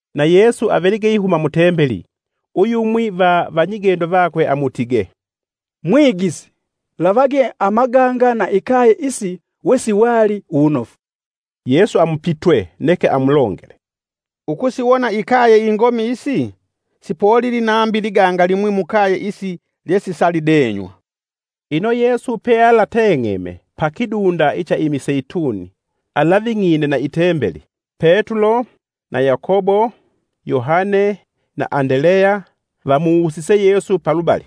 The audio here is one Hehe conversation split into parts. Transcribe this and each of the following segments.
Na Yesu avelige ihuma mu Tembeli uyumwi va vanyigendo vakwe amutige, “Mwigisi, lavage amaganga na ikaye isi wesiwali uwunofu.” Yesu amupitwe, neke amulongele, “Ukusiwona ikaye ingomi isi? sipolili nambi iliganga limwi mukaye isi lyesisalidenywa.” Ino Yesu pealateng'eme pa kidunda icha imiseituni alaving'ine na itembeli, Petulo, na Yakobo, Yohane na Andeleya vamuwusise Yesu palubali,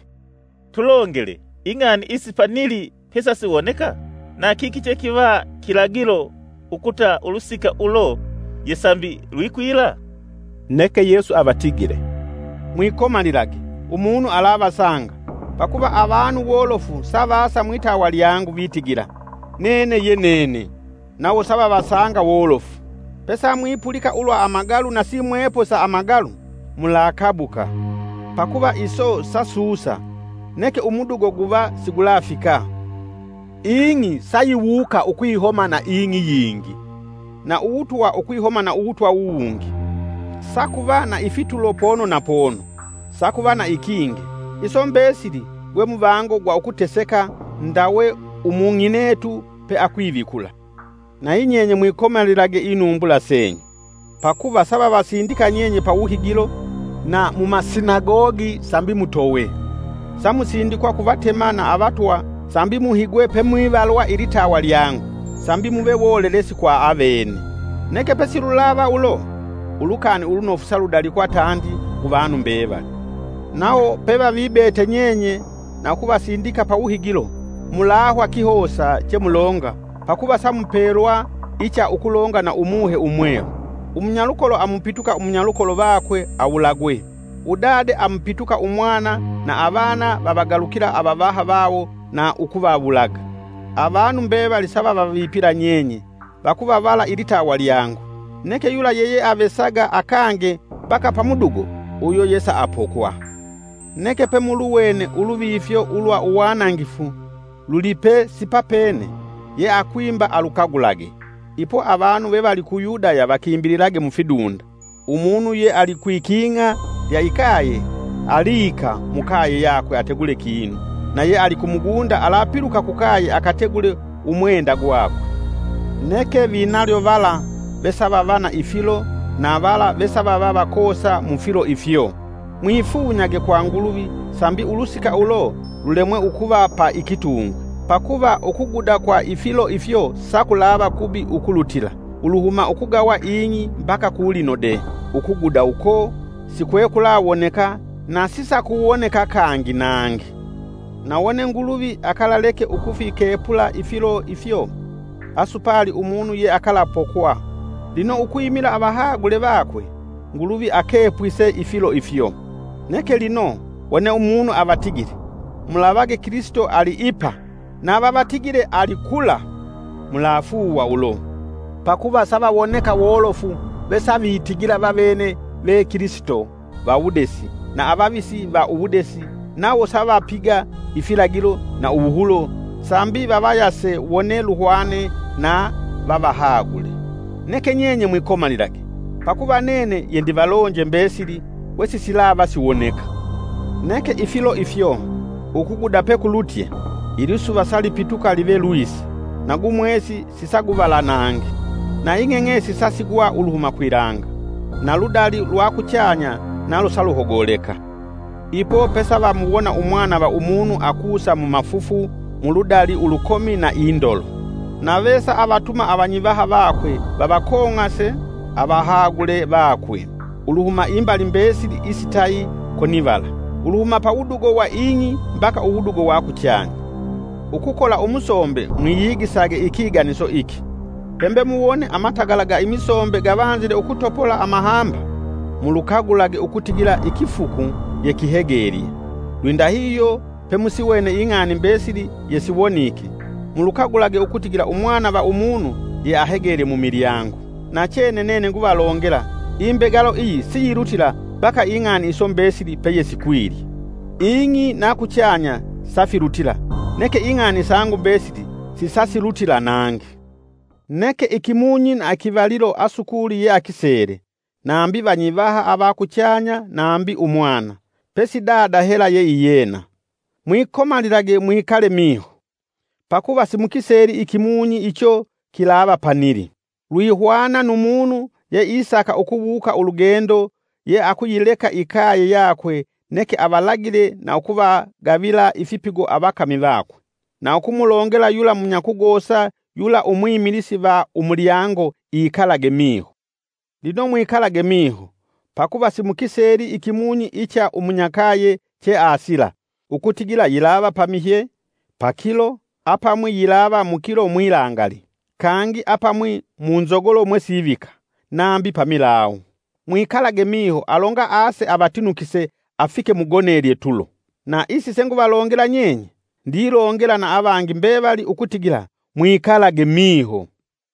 “Tulongele, ing'ani isi panili pesasiwoneka? Na kiki chekiva kilagilo ukuta ulusika ulo yesambi lwikwila?” Neke Yesu avatigile, “Mwikomalilage, umunu alavasanga. Pakuva avanu wolofu savasa mwitawa lyangu, vitigila, ‘Nene ye nene!’ Nawo savavasanga wolofu. Pesamwipulika ulwa amagalu na simwepo sa amagalu, mulakabuka. Pakuva iso sasusa, neke umudugo guva sigulafika. Ing'i sayiwuka ukwihoma na ing'i yingi, na uwutwa ukwihoma na uwutwa uwungi; sakuva na ifitulo pono na pono, sakuva na ikinge. Iso mbesili gwemuvango gwa ukuteseka ndawe umung'inetu peakwivikula. “Nayi nyenye mwikomalilage inumbula senyu. Pakuva savavasindika nyenye pawuhigilo, na mumasinagogi sambi mutowe, samusindikwa ku vatema na avatwa sambi muhigwe pemwivalwa ilitawa lyangu, sambi muve wolelesi kwa avene. Neke pesilulava ulo. Ulukani Ulunofu sa ludalikwa tandi kuvanu mbevali. Nawo pevavibete nyenye na ukuvasindika pawuhigilo, mulahwa kihosa chemulonga, pakuva samupelwa icha ukulonga na Umuhe Umwelu. Umunyalukolo amupituka umunyalukolo vakwe awulagwe; udade amupituka umwana; na avana vavagalukila avavaha vawo na ukuvawulaga. Avanu mbevali savavavipila nyenye, vakuvavala ilitawa lyangu. Neke yula yeyeavesaga akange mbaka pamudugo uyo yesaapokwa. “Neke pemuluwene ‘Uluvifyo ulwa Uwanangifu’ lulipe sipapene. (Ye akwimba alukagulage!) ipo avanu ve vali ku Yudaya vakimbililage mufidunda. Umunu ye alikwiking'a lya ikaye aliika mukaye yakwe ategule kinu. Na ye ali kumugunda alapiluka kukaye akategule umwenda gwakwe. Neke vinalyo vala vesavava na ifilo na vala vesavakoosa mufilo ifyo! Mwifunyage kwa Nguluvi sambi ulusika ulo, lulemwa ukuva pa ikitungwi. Pakuva ukuguda kwa ifilo ifyo sakulava kubi ukulutila, uluhuma ukugawa ing'i mbaka ku lino de, ukuguda uko sikwekulawoneka, na sisakuwoneka kangi nangi. Na wone Nguluvi akalaleke ukufikepula ifilo ifyo, asupali umunu yeakalapokwa. Lino ukwimila avahagule vakwe, Nguluvi akepwise ifilo ifyo. “Neke lino, wone umunu avatigile, ‘Mulavage Kilisito ali ipa!’ ‘Na vavatigile ali kula’ mulafuuwa ulo. Pakuva savawoneka wolofu vesavitigila vavene ve Kilisito va wudesi na avavisi va uwudesi nawo savapiga ifilagilo na uwuhulo, sambi vavayase wone luhwane na vavahagule. Neke nyenye mwikomalilage. Pakuva nene yendivalonje mbesili wesisilava siwoneka. “Neke ifilo ifyo, ukuguda pekulutye, ilisuva salipituka live lwisa, na gumwesi sisaguvala nangi. Na ing'eng'esi sasigwa uluhuma kwilanga, na ludali ulwa kuchanya nalo saluhogoleka. Ipo pesavamuwona Umwana va Umunu akusa mumafufu mu ludali ulukomi na indolo. Nave saavatuma vanyivaha vakwe vavakong'ase; avahagule vakwe, uluhuma imbali mbesili isitayi konivala, uluhuma pawudugo wa ing'i mbaka uwudugo wa kuchanya. “Ukukola umusombe mwiyigisage ikiganiso iki: Pembe muwone matagala ga imisombe gavanzile ukutopola amahamba, mulukagulage ukutigila ikifuku yekihegelye. Lwindahihyo pemusiwene ing'ani mbesili yesiwonike, mulukagulage ukutigila Umwana va Umunu yeahegelye mumilyango. Nachene nene nguvalongela, imbegalo iyi siyilutila mbaka ing'ani iso mbesili peyesikwilye. Ing'i na kuchanya safilutila, neke ing'ani sangu mbesili sisasilutila nangi. “Neke ikimunyi na ikivalilo asukuli yeakisele; nambi vanyivaha ava kuchanya nambi Umwana; pesi Dada hela yeiyena. Mwikomalilage mwikale miho, pakuva simukiseli ikimunyi icho kilava panili. Lwihwana nu umunu yeisaka ukuwuuka ulugendo yeakuyileka yeailesile ikaye yakwe neke avalagile na ukuvagavila ifipigo avakami vakwe, na ukumulongela yula munyakugosa yula umwimilisi va umulyango ikalage miho. Lino mwikalage miho, pakuva simukiseli ikimunyi icha umunyakaye cheasila; ukutigila yilava pamihye, pakilo, apamwinga yilava mukilo mwilangali, kangi apamwi munzogolo mwesivika, nambi pamilawu. Mwikalage miho alonga ase avatinukise afike mugonelye tulo. Na isi senguvalongela nyenye, ndilongela na avangi mbevali ukutigila: Mwikalage miho!”